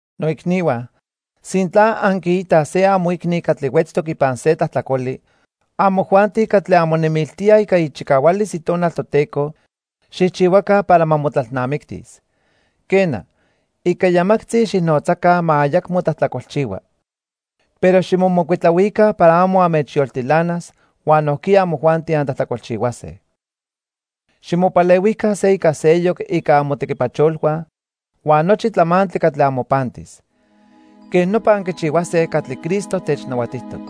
Noicnihua, sintla anquiitaj se amoicni catli huetztoc ipan se tlajtlacoli, amojuanti catli anmonemiltíaj ica ichicahualis Itonal Toteco xijchihuaca para ma motlalnamictis. Quena, ica yamactzi xijnotzaca ma ayacmo tlajtlacolchihua. Pero ximomocuitlahuica para amo anmechyoltilanas huan nojquiya amojuanti antlajtlacolchihuase. Ximopalehuica se ica seyoc ica amotequipacholhua huan nochi tlamantli catli amopantis. Quej nopa anquichihuase catli Cristo technahuatijtoc.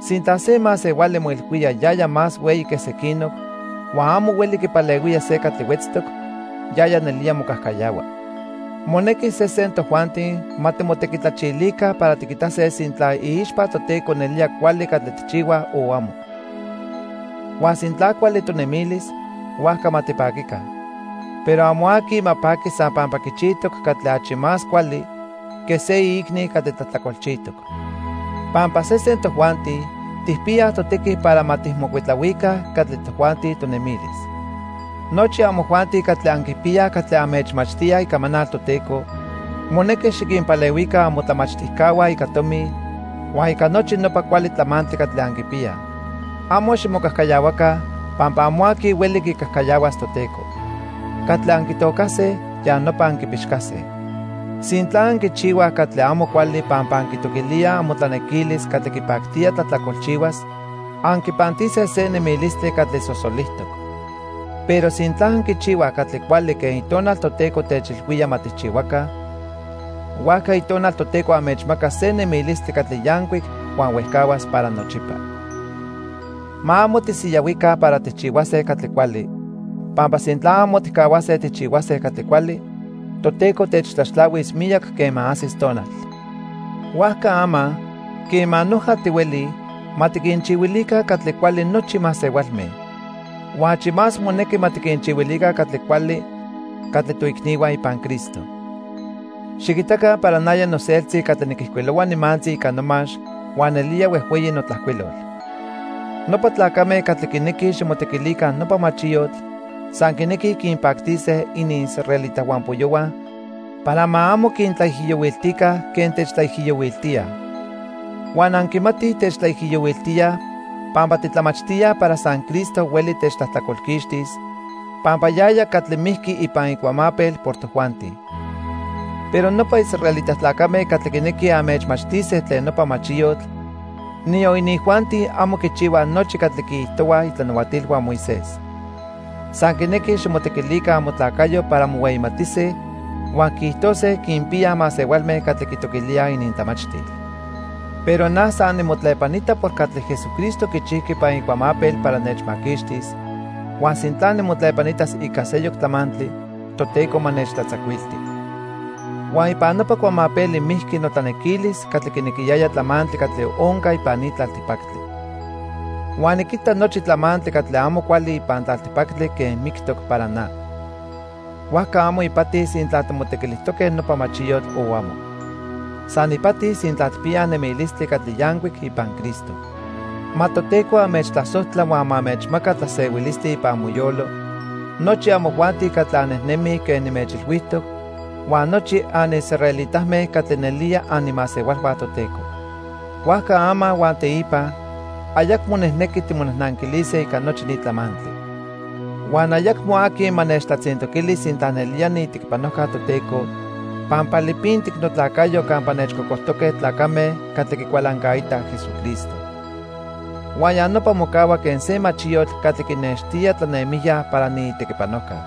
Sintla se masehuali moilhuía yaya más hueyi quej sequinoc huan amo hueli quipalehuía se catli huetztoc, yaya nelía mocajcayahua. Monequi sesen tojuanti ma timotequitlachilica para tiquitase sintla iixpa Toteco nelía cuali catli tijchihuaj o amo. Huan sintla cuali tonemilis, huajca ma tipaquica, pero amo aqui ma paqui san pampa quichijtoc catli achi más cuali que se iicni catli tlajtlacolchijtoc. Pampa sesen tojuanti tijpiyaj totequi para ma tijmocuitlahuica catli tojuanti tonemilis. Nochi amojuanti catli anquipiyaj catli anmechmachtíaj icamanal Toteco, monequi xiquinpalehuica amotlamachtijcahua ica tomi huan ica nochi nopa cuali tlamantli catli anquipiyaj. Amo ximocajcayahuaca pampa amo aqui hueli quicajcayahuas Toteco. Catli anquitocase, ya nopa anquipixcase. Sintla anquichihuaj catli amo cuali pampa anquitoquilíaj amotlanequilis catli quipactía tlajtlacolchihuas, anquipantise se nemilistli catli sosolijtoc. Pero sintla anquichihuaj catli cuali quen Itonal Toteco techilhuía ma tijchihuaca, huajca Itonal Toteco anmechmacas se nemilistli catli yancuic huan huejcahuas para nochipa. Ma amo tisiyahuica para tijchihuase catli cuali, pampa sintla amo tijcahuase tijchihuase catli cuali, Toteco techtlaxtlahuis miyac quema ajsis tonal. Huajca ama, quema noja tihuelij, ma tiquinchihuilica catli cuali nochi masehualme. Huan achi más monequi ma tiquinchihuilica catli cuali catli toicnihua ipan Cristo. Xiquitaca para naya noseltzi catli niquijcuilohua nimantzi ica nomax huan nelía huejhueyi notlajcuilol. Nopa tlacame catli quinequij ximotequilica nopa machiyotl san quinequij quinpactise iniisraelita huampoyohua para ma amo quintlaijiyohuiltica quen techtlaijiyohuiltíaj. Huan anquimatij techtlaijiyohuiltíaj pampa titlamachtíaj para san Cristo hueli techtlajtlacolquixtis, pampa yaya catli mijqui ipan icuamapel por tojuanti. Pero nopa israelita tlacame catli quinequij anmechmachtise tlen nopa machiyotl, niyon inijuanti amo quichihuaj nochi catli quiijtohuaj itlanahuatilhua Moisés. San quinequij ximotequilica amotlacayo para mohueyimatise huan quiijtose quinpiyaj masehualme catli quitoquilíaj inintlamachtil. Pero na san nimotlepanita por catli Jesucristo quichijqui ipan icuamapel para nechmaquixtis huan sintla nimotlepanitas ica seyoc tlamantli, Toteco ma nechtlatzacuilti. Huan ipan nopa cuamapeli mijqui notlanequilis catli quinequiyaya tlamantli catli onca ipan ni tlaltipactli. Huan niquita nochi tlamantli catli amo cuali ipan tlaltipactli quen mictoc para na. Huajca amo ipati sintla timotequilijtoque nopa machiyotl o amo. San ipati sintla tijpiyaj nemilistli catli yancuic ipan Cristo. Ma Toteco anmechtlasojtla huan ma anmechmaca tlasehuilistli ipan amoyolo nochi amojuanti catli annejnemij quen nimechilhuijtoc huan nochi anisraelitame catli nelía animasehualhua Toteco. Huajca ama huan teipa ayacmo nijnequi timonajnanquilise ica nochi ni tlamantli. Huan ayacmo aqui ma nechtlatzintoquili sintla nelía niitequipanojca Toteco, pampa lipintic notlacayo campa nechcocojtoque tlacame catli quicualancaitaj Jesucristo. Huan ya nopa mocahua quen se machiyotl catli quinextía tlanemijya para niitequipanojca.